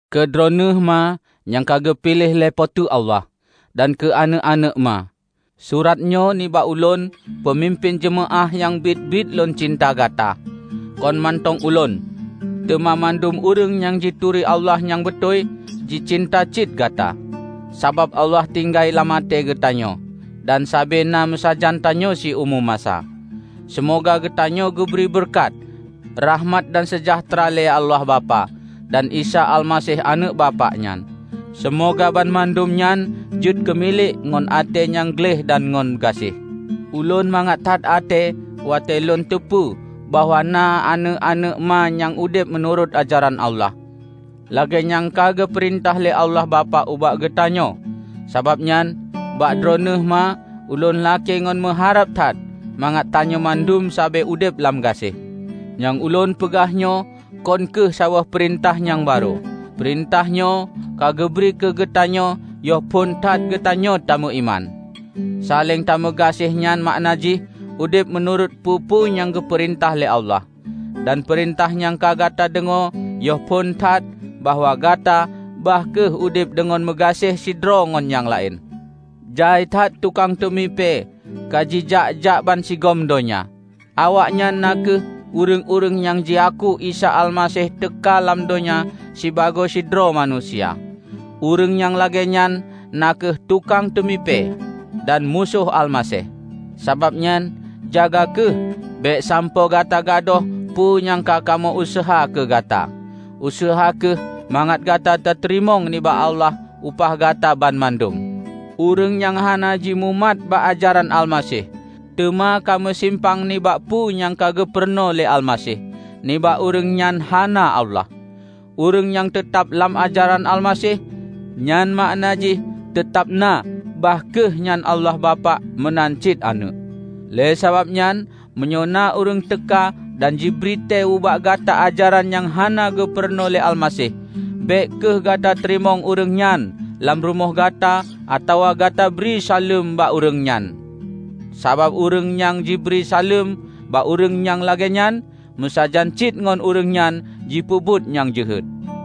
Keu droe neuh Ma nyang ka geupiléh lé Po teu Allah, dan keu aneuëk-aneuëk Ma. Surat nyoe nibak ulôn, peumimpén jeumaáh nyang biet-biet lôn cinta gata. Kon mantong ulôn, teuma mandum ureuëng nyang jituri Allah nyang beutôi, jicinta cit gata. Sabab Allah tinggai lam até geutanyoe, dan sabe na meusajan tanyoe siumu masa. Seumoga geutanyoe geubri beureukat, rakhmat dan seujahteura lé Allah Bapak, dan Isa Almaseh Aneuëk Bapak nyan. Seumoga banmandum nyan jeuet keumilék ngon até nyang gleh dan ngon gaséh. Ulôn mangat that até watée lôn teupeue bahwa na aneuëk-aneuëk Ma nyang udeb meunurot ajaran Allah, lagée nyang ka geupeurintah lé Allah Bapak ubak geutanyoe. Sabab nyan, bak droeneueh Ma ulôn lakée ngon meuharab that mangat tanyoe mandum sabe udeb lam gaséh. Nyang ulôn peugah nyoe kon kheueh saboh peurintah nyang barô; peurintah nyoe ka geubri keugeutanyoe yoh phon that geutanyoe tameuiman. Saléng tameugaséh nyan makna jih udeb meunurot peue-peue nyang geupeurintah lé Allah. Dan peurintah nyang ka gata deungoe yoh phon that bahwa gata bah kheueh udeb deungon meugaséh sidroe ngon nyang laén. Jai that tukang teumipée kajijak-jak bansigom donya. Awaknyan na kheueh ureuëng-ureuëng nyang jiaku Isa Almaseh teuka lam donya sibagoe sidroe manusia. Ureuëng nyang lagée nyan na kheueh tukang teumipée, dan Musoh Almaseh. Sabab nyan, jaga kheueh bék sampoe gata gadôh peue nyang ka kamoe useuha keu gata. Useuha kheueh mangat gata tateurimong nibak Allah upah gata banmandum. Ureuëng nyang hana jimumat bak ajaran Almaseh, teuma ka meusimpang nibak peue nyang ka geupurunoe lé Almaseh, nibak ureuëng nyan hana Allah. Ureuëng nyang teutab lam ajaran Almaseh, nyan makna jih teutab na bah kheueh nyan Allah Bapak meunan cit Aneuëk. Lé sabab nyan, meunyoe na ureuëng teuka dan jibri tée ubak gata ajaran nyang hana geupurunoe lé Almaseh, bék kheueh gata teurimong ureuëng nyan lam rumoh gata atawa gata bri saleuem bak ureuëng nyan. Sabab ureuëng nyang jibri saleuem bak ureuëng nyang lagée nyan meusajan cit ngon ureuëng nyan jipeubuet nyang jeuhet.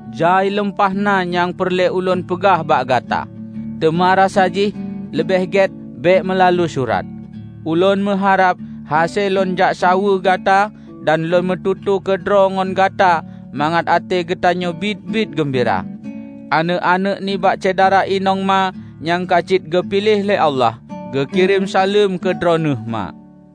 Jai lumpah na nyang peureulée ulôn peugah bak gata, teuma rasa jih leubeh gét bék meulalu surat. Ulôn meuharab hase lôn jaksaweue gata dan lôn meututoe keudroe ngon gata, mangat até geutanyoe biet-biet geumbira. Aneuëk-aneuëk nibak syedara inong Ma nyang ka cit geupiléh lé Allah, geukirém saleuem keu droeneueh Ma.